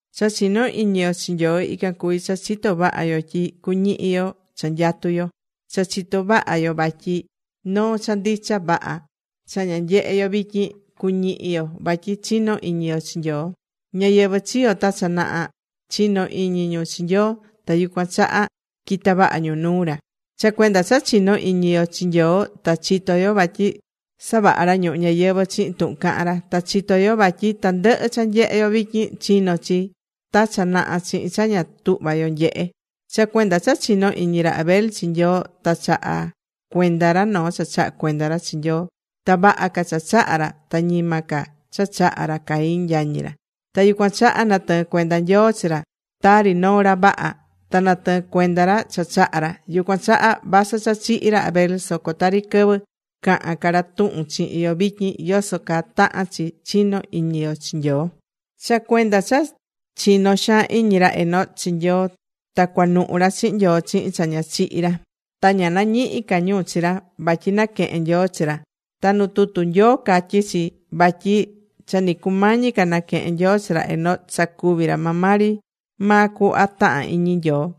Cha chinó iñi yo chi Nyoo ican cuví cha chitó vaha yo tyi cuñihi yo cha nyatú yo, ta chitó vaha yo vatyi noo cha ndicha vaha cha ña nyehé yo vityin, cuñihi yo vatyi chinó iñi yo chi Nyoo. Ñáyɨvɨ chiyo̱ ta cha naha, chino̱ iñi ñu chi Nyoo, ta yucuan chaha quita̱ vaha ñu nuu ra. Cha cuenda cha chinó iñi yo chi Nyoo, ta chitó yo vatyi savaha̱ ra ñuhu ñayɨvɨ̱ chihin tuhun cahán ra. Ta chitó yo vatyi tandɨhɨ cha nyehé yo vityin, chino̱ chi ta cha naha chihin cha ña tuhva yo nyehé. Cha cuenda cha chino̱ iñi ra Abel chi Nyoo, ta chaha̱ cuenda ra noo cha chaha̱ ra chi Nyoo. Ta vaha ca cha chaha̱ ra ta ñima ca cha chaha̱ ra Caín, yañi ra. Ta yucuan chaha natɨɨ̱n cuenda Nyoo chi ra tari noo ra vaha, ta natɨɨ̱n cuenda ra cha chaha̱ ra. Yucuan chaha vasɨ cha chihi̱ ra Abel, soco tari quɨvɨ cahán ca ra tuhun chihin yo vityin, yoso caa tahán chi chino iñi yo chi Nyoo. Cha cuenda cha chino̱ xaan iñi ra Enoc chi Nyoo, ta cuanuhu̱ ra chihin Nyoo chihin cha ña chihi̱ ra. Ta ña nañihi̱ ca ñu chi ra, vatyi naquehe̱n Nyoo chi ra. Ta nu tutu Nyoo, catyí chi vatyi cha ni cumañi ca naquehen Nyoo chi ra Enoc, sacuví ra maa ri maa cuhva tahán iñi Nyoo,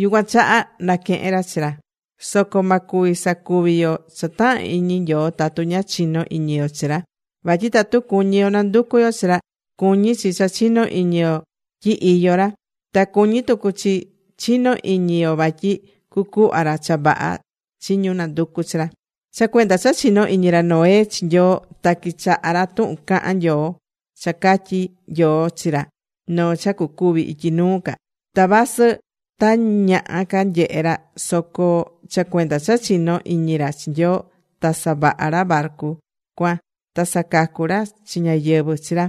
yucuan chaha naquehe̱n ra chi ra. Soco ma cuvi sacuvi yo cha tahán iñi Nyoo tatu ña chinó iñi yo chi ra. Vatyi tatu cuñí yo nanducu yo chi ra, cuñí chi cha chinó iñi yo tyi iyó ra. Ta cuñí tucu chi chinó iñi yo vatyi cucuhva ra cha vaha chi ñu nanducú chi ra. Cha cuenda cha chino̱ iñi ra Noé chi Nyoo, ta quichaha̱ ra tuhun caha̱n Nyoo, cha catyi̱ Nyoo chi ra noo cha cucuvi ityi nuu ca. Ta vasɨ tañaha ca nyehe ra soco cha cuenda cha chinó iñi ra chi Nyoo, ta savaha̱ ra barcu cuan ta sacacu̱ ra chi ñáyɨvɨ chi ra.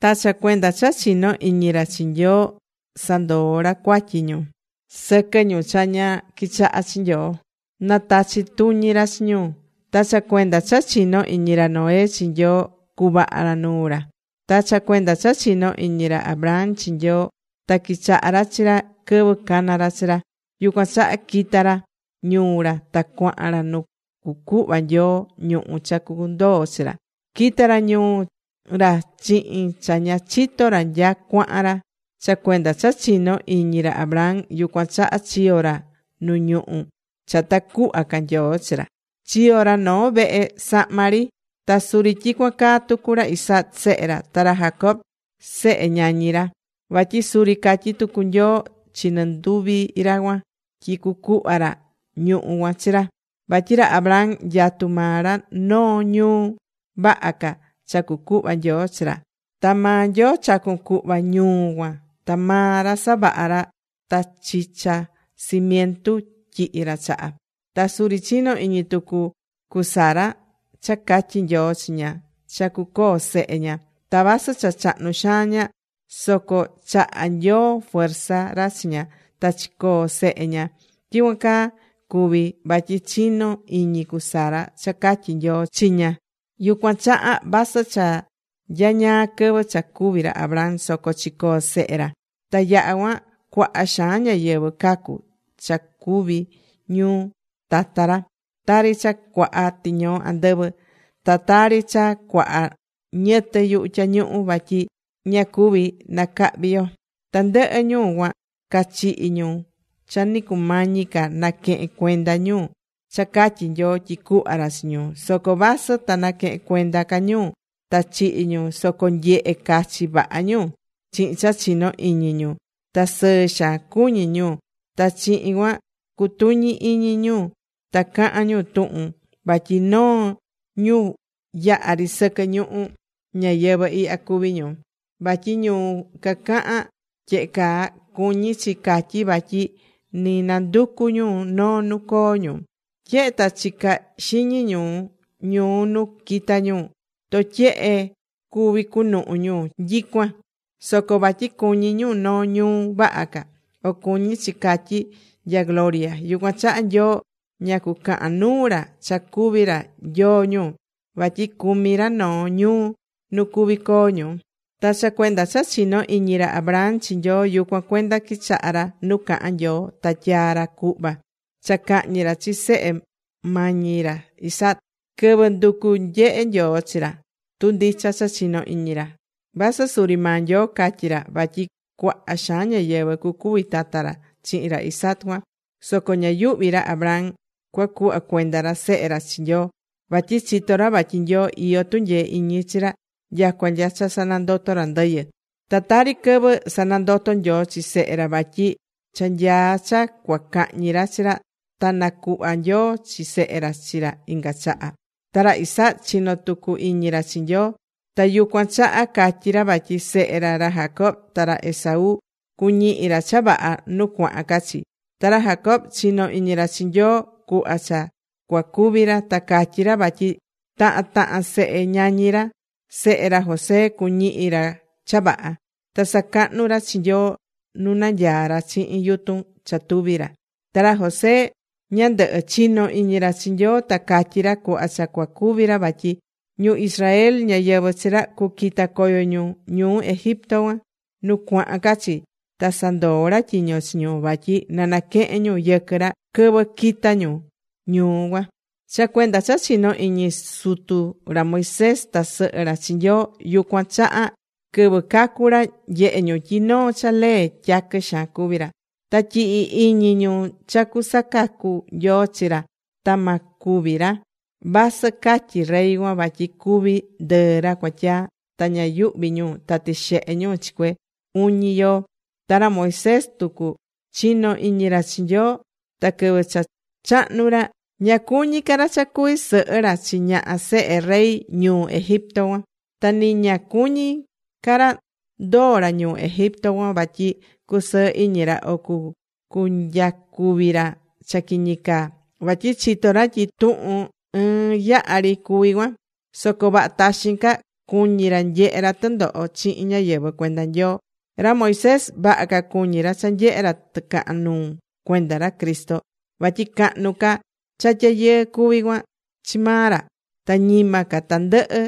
Ta cha cuenda cha chino̱ iñi ra chi Nyoo, sandoo̱ ra cuatyi ñu sɨquɨ ñu cha ña quichahá chi Nyoo, na tachi tuñi ra chi ñu. Ta cha cuenda cha chino̱ iñi ra Noé chi Nyoo cuvaha̱ ra nuu ra. Ta cha cuenda cha chino̱ iñi ra Abraham chi Nyoo, ta quichaha̱ ra chi ra quɨvɨ cana̱ ra chi ra. Yucuan chaha quita̱ ra ñuu ra ta cuahan ra nu cucuhva Nyoo ñuhú cha cundoo chi ra. Quita̱ ra ñuu ra chihin cha ña chitó ra nya cuahan ra. Cha cuenda cha chinó iñi ra Abraham, yucuan chaha chiyo̱ ra nu ñuhú cha ta cuhva ca Nyoo chi ra. Chiyo̱ ra noo vehe sahma ri, ta suri tyicuan caa tucu ra Isaac, sehe ra, ta ra Jacob, sehe ñañi ra. Vatyi suri catyi̱ tucu Nyoo chi nɨnduvi ra cuan tyi cucuhva ra ñuhú cuan chi ra. Vatyi ra Abraham nyatú maa ra noo ñuu vaha ca cha cucuhva Nyoo chi ra, ta maa Nyoo chacu̱n cuhva ñuu cuan ta maa ra savaha̱ ra, ta chicha cimientu tyihi ra chaha. Ta suri chino̱ iñi tucu cu Sara cha catyi̱ Nyoo chi ña cha cucoo sehe ña. Ta vasɨ cha chahnu xaan ña, soco chaha̱ Nyoo fuerza ra chi ña, ta chicoo̱ sehe ña. Tyicuan caa cuvi̱ vatyi chino̱ iñi cu Sara cha catyi̱ Nyoo chi ña. Yucuan chaha vasɨ cha nyañaa quɨvɨ cha cúvi ra Abraham, soco chicoo̱ sehe ra. Ta yaha̱ cuan cuaha xaan ñáyɨvɨ cacu̱ cha cuvi̱ ñu tata ra. Tari cha cuaha tiñoo andɨvɨ, ta tari cha cuaha niyɨtɨ yuhu tyañuhu, vatyi ña cuví nacahvi yo. Tandɨhɨ ñu cuan cachihi̱ ñu cha ni cumañi ca naquehe̱n cuenda ñu cha catyi̱ Nyoo tyi cuhva ra chi ñu. Soco vasɨ ta naquehen cuenda ca ñu ta chihi̱ ñu soco nyehe̱ cachi vaha ñu chihin cha chinó iñi ñu. Ta sɨɨ xaan cuñí ñu. Ta chihin cuan cutuñí iñi ñu ta cahán ñu tuhun vatyi noo ñu yahá ri sɨquɨ ñuhu ñayɨvɨ̱ ihya cuví ñu. Vatyi ñu cacahán tyehe caa, cuñí chi catyí vatyi ni nanducú ñu noo nu coo ñu. Tyehe ta chicá ca xiñi ñu ñuu nu quita̱ ñu, totyehe cuví cunuhu ñu nyicuan. Soco vatyi cuñí ñu noo ñuu vaha ca, o cuñí chi catyí nya gloria, yucuan chaha Nyoo ña cucahan nuu ra cha cuví ra Nyoo ñu. Vatyi cumí ra noo ñuu nu cuví coo ñu. Ta cha cuenda cha chino̱ iñi ra Abraham chi Nyoo, yucuan cuenda quichaha̱ ra nu cahan Nyoo ta tyaa̱ ra cuhva cha cahñi ra chi sehe mañi ra ra Isaac, quɨvɨ nducu nyehe Nyoo chi ra tu ndicha cha chinó iñi ra, vasɨ suri maa Nyoo catyi̱ ra vatyi cuaha xaan ñáyɨvɨ cucuvi tata ra chihin ra Isaac cuan. Soco ña yuhvi̱ ra Abraham cuacuhva cuenda ra sehe ra chi Nyoo, vatyi chitó ra vatyi Nyoo, iyó tunyee iñi chi ra nyacua nya cha sanandotó ra ndɨyɨ. Ta tari quɨvɨ sanandoto̱ Nyoo chi sehe ra, vatyi cha nyaá cha cua cahñi ra chi ra, ta nacuhva̱ Nyoo chi sehe ra chi ra inga chaha. Ta ra Isaac chino̱ tucu iñi ra chi Nyoo. Ta yucuan chaha catyí ra vatyi sehe ra, ra Jacob ta ra Esaú, cuñihi ra cha vaha nu cuahan ca chi. Ta ra Jacob chino̱ iñi ra chi Nyoo, cuhva cha cua cúvi ra. Ta catyí ra vatyi tahan tahan sehe ñañi ra, sehe ra José, cuñihi ra cha vaha. Ta sacahnu̱ ra chi Nyoo nu nanyaá ra chihin yutun cha tuví ra. Ta ra José ñandɨhɨ, chino̱ iñi ra chi Nyoo, ta catyi̱ ra, cuhva cha cua cúvi ra, vatyi ñu Israel, ñáyɨvɨ chi ra, cu quita coyo ñu ñuu Egipto cuan nu cuahan ca chi. Ta sandoo̱ ra tyiño chi ñu, vatyi na naquehen ñu yɨquɨ ra quɨvɨ quita ñu ñuu cuan. Cha cuenda cha chino̱ iñi sutu ra Moisés ta sɨhɨ ra chi Nyoo, yucuan chaha quɨvɨ cacu̱ ra, nyehe̱ ñu tyi noo cha lee tyaquɨ xaan cuví ra. Ta yɨhɨ̱ iñi ñu cha cusacacu Nyoo chi ra ta ma cúvi ra, vasɨ catyi̱ rey cuan vatyi cúvi ndɨɨ ra cuatyaa. Ta ña yuhvi̱ ñu ta tixehe̱ ñu chi cue uñi yoo. Ta ra Moisés tucu, chino̱ iñi ra chi Nyoo. Ta quɨvɨ cha chahnu̱ ra, ña cuñi̱ ca ra cha cuvi sɨhɨ ra chi ñaha sehe rey ñuu Egipto cuan. Ta nɨ ña cuñí ra ndoo ra ñuu Egipto cuan vatyi cusɨɨ iñi ra o cunyacuvi ra cha quiñi caa. Vatyi chitó ra tyi tuhun ɨɨn yaha ri cuví cuan. Soco vaha taxin ca cuñí ra nyehe ra tɨndoho chihin ñáyɨvɨ cuenda Nyoo. Ra Moisés, vaha ca cuñí ra cha nyehe ra tɨcahan nuu cuenda ra Cristo vatyi cahnu ca cha tyayɨɨ cuví cuan chi maa ra ta ñima ca tandɨhɨ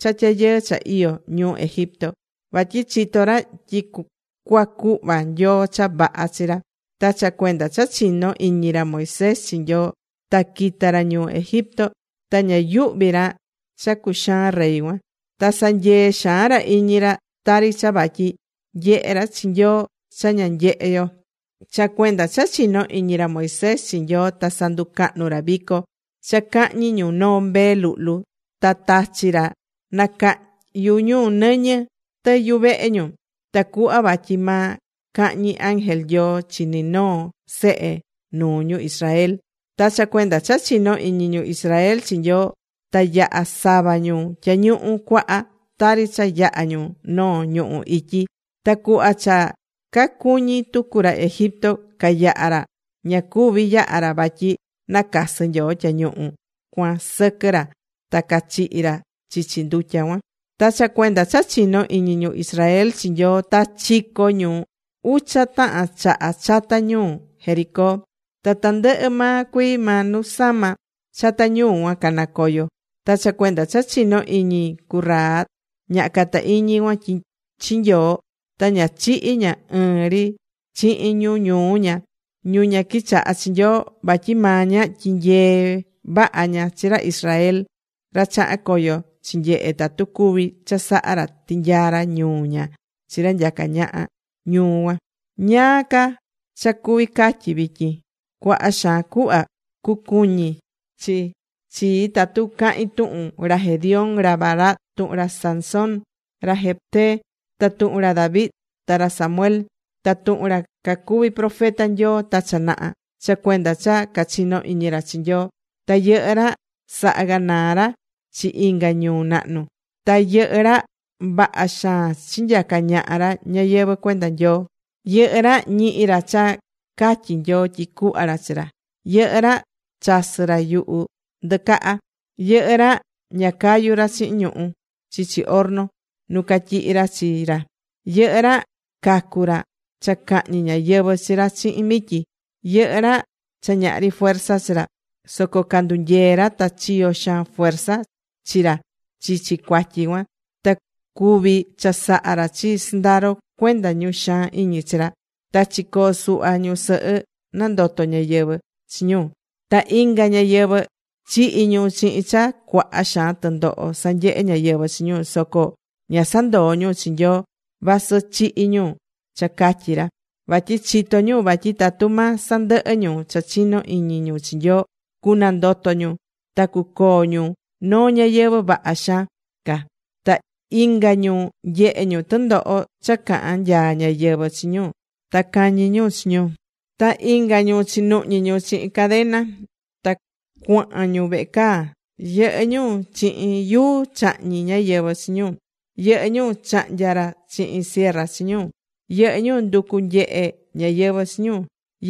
cha tyayɨɨ cha iyó ñuu Egipto. Vatyi chitó ra tyi cua cuhva Nyoo cha vaha chi ra. Ta cha cuenda cha chino̱ iñi ra Moisés chi Nyoo, ta quita̱ ra ñuu Egipto, ta ña yuhvi̱ ra cha cuxaán rey cuan. Ta sanyee̱ xaan ra iñi ra. Tari cha vatyi nyehe̱ ra chi Nyoo cha ña nyehé yo. Cha cuenda cha chino̱ iñi ra Moisés chi Nyoo ta sanducahnu̱ ra vico cha cahñi ñu noo mbee luhlu, ta tachi̱ ra nacahyu ñu nɨñɨ tɨ yuvehe ñu, tacuhva vatyi ma cahñi ángel Nyoo chi ni noo sehe nuu ñu Israel. Ta cha cuenda cha chino̱ iñi ñu Israel chi Nyoo ta yaha̱ sava ñu Tyañuhu Cuaha, tari cha yaha̱ ñu noo ñuhú ityi. Ta cuhva cha cacuñi̱ tucu ra Egipto cayaha ra, ña cuvi̱ yaha ra vatyi nacasɨ Nyoo tyañuhu cuan sɨquɨ ra ta cachihi̱ ra chichi ndutya cuan. Ta cha cuenda cha chino̱ iñi ñu Israel chi Nyoo, ta chico̱ ñu ucha tahan chaha chata ñuu Jericó, ta tandɨhɨ cuii maa nu sama chata ñuu cuan canacoyo̱. Ta cha cuenda cha chino̱ iñi cu Rahab, ñaha cata iñi cuan, chi Nyoo, ta ña chihi̱ ña ɨɨn ri chihin ñu ñuu ña, ñu ña quichaha̱ chi Nyoo, vatyi maa ña, tyinyee̱ vaha ña chi ra Israel, ra chaha̱n coyo chinyehe̱ tatu cuví chasaha ra tinyaa ra ñuu ña chi ra nyacá ñaha ñuu cuan. ¿Ñáá ca cha cuví catyi vityin? Cuaha xaan cuhva cucuñi chi chii tatu cahín tuhun ra Gedeón, ra Barac, tuhun ra Sansón, ra Jefté, ta tuhun ra David, ta ra Samuel ta tuhun ra cacuvi̱ profeta Nyoo ta cha naha. Cha cuenda cha cachino̱ iñi ra chi Nyoo, ta yɨhɨ́ ra saha̱ ganaa ra chi inga ñuu nahnu. Ta yɨhɨ́ ra vaha xaan chinyaca̱ ñaha ra ñáyɨvɨ cuenda Nyoo. Yɨhɨ́ ra ñihi̱ ra cha catyi̱ Nyoo tyi cuhva ra chi ra. Yɨhɨ́ ra chasɨ̱ ra yuhu ndɨcaha. Yɨhɨ́ ra ña cayu ra chihin ñuhu̱ chichi horno nu catyihi̱ ra chi ra. Yɨhɨ́ ra cacu̱ ra cha cahñi ñáyɨvɨ chi ra chihin mityi. Yɨhɨ́ ra cha ñahri fuerza chi ra, soco candunyee̱ ra, ta chiyo̱ xaan fuerza chi ra chichi cuatyi cuan, ta cuvi̱ chasaha ra chi sɨndaro cuenda ñu xaan iñi chi ra. Ta chicoo̱ suhva ñusɨhɨ, nandoto̱ ñáyɨvɨ chi ñu. Ta inga ñáyɨvɨ chihi̱ ñu chihin cha cuaha xaan tɨndoho sanyehe̱ ñáyɨvɨ chi ñu, soco ña sandoo̱ ñu chi Nyoo vasɨ chihi̱ ñu cha catyi ra, vatyi chitó ñu, vatyi tatu ma sandɨhɨ ñu cha chinó iñi ñu chi Nyoo, cunandoto ñu ta cucoo ñu noo ñayɨvɨ̱ vaha xaan ca. Ta inga ñu nyehe̱ ñu tɨndoho cha cahán nyaa ñáyɨvɨ chi ñu ta cañi̱ ñu chi ñu. Ta inga ñu chinuhñi̱ ñu chihin cadena ta cuahan ñu vehe caa. Yɨhɨ́ ñu chihin yuu chahñi̱ ñáyɨvɨ chi ñu. Yɨhɨ́ ñu chahnya̱ ra chihin cierra chi ñu. Yɨhɨ́ ñu nducu̱ nyehe ñáyɨvɨ chi ñu.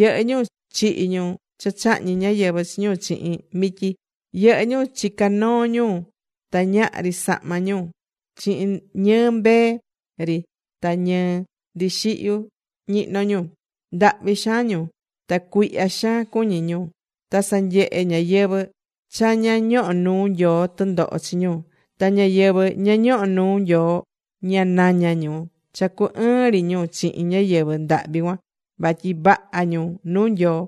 Yɨhɨ́ ñu chihi̱ ñu cha chahñi̱ ñáyɨvɨ chi ñu chihin mityi. Yɨhɨ́ ñu chica̱ noo ñu ta ñahri sahma ñu. Chihin ñɨɨ mbee ri ta ñɨɨ ndixihyu ñihno̱ ñu. Ndahvi xaan ñu. Ta cuihya xaan cuñí ñu. Ta sanyehe̱ ñáyɨvɨ cha ña ñohó nuu Nyoo tɨndoho chi ñu. Ta ñáyɨvɨ ña ñohó nuu Nyoo ña nañá ñu cha cu ɨɨn ri ñu chihin ñáyɨvɨ ndahvi cuan vatyi vaha ñu nuu Nyoo.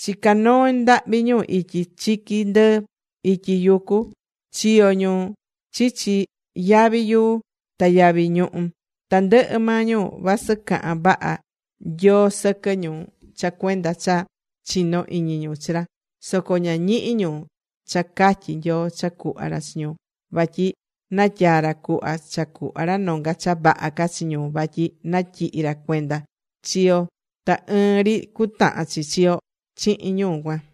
Chica̱ noo ndahvi ñu ityi chiqui ndɨɨ, ityi yucu. Chiyo̱ ñu chichi yavi yuu ta yavi ñuhú. Tandɨhɨ maa ñu vasɨ caha̱n vaha Nyoo sɨquɨ ñu cha cuenda cha chinó iñi ñu chi ra, soco ña ñihi̱ ñu cha catyi̱ Nyoo cha cuhva ra chi ñu. Vatyi natyaa̱ ra cuhva, cha cuhva ra nonga cha vaha ca chi ñu vatyi natyihi̱ ra cuenda chi yo ta ɨɨn ri cutahan chi chi yo chihin ñu cuan.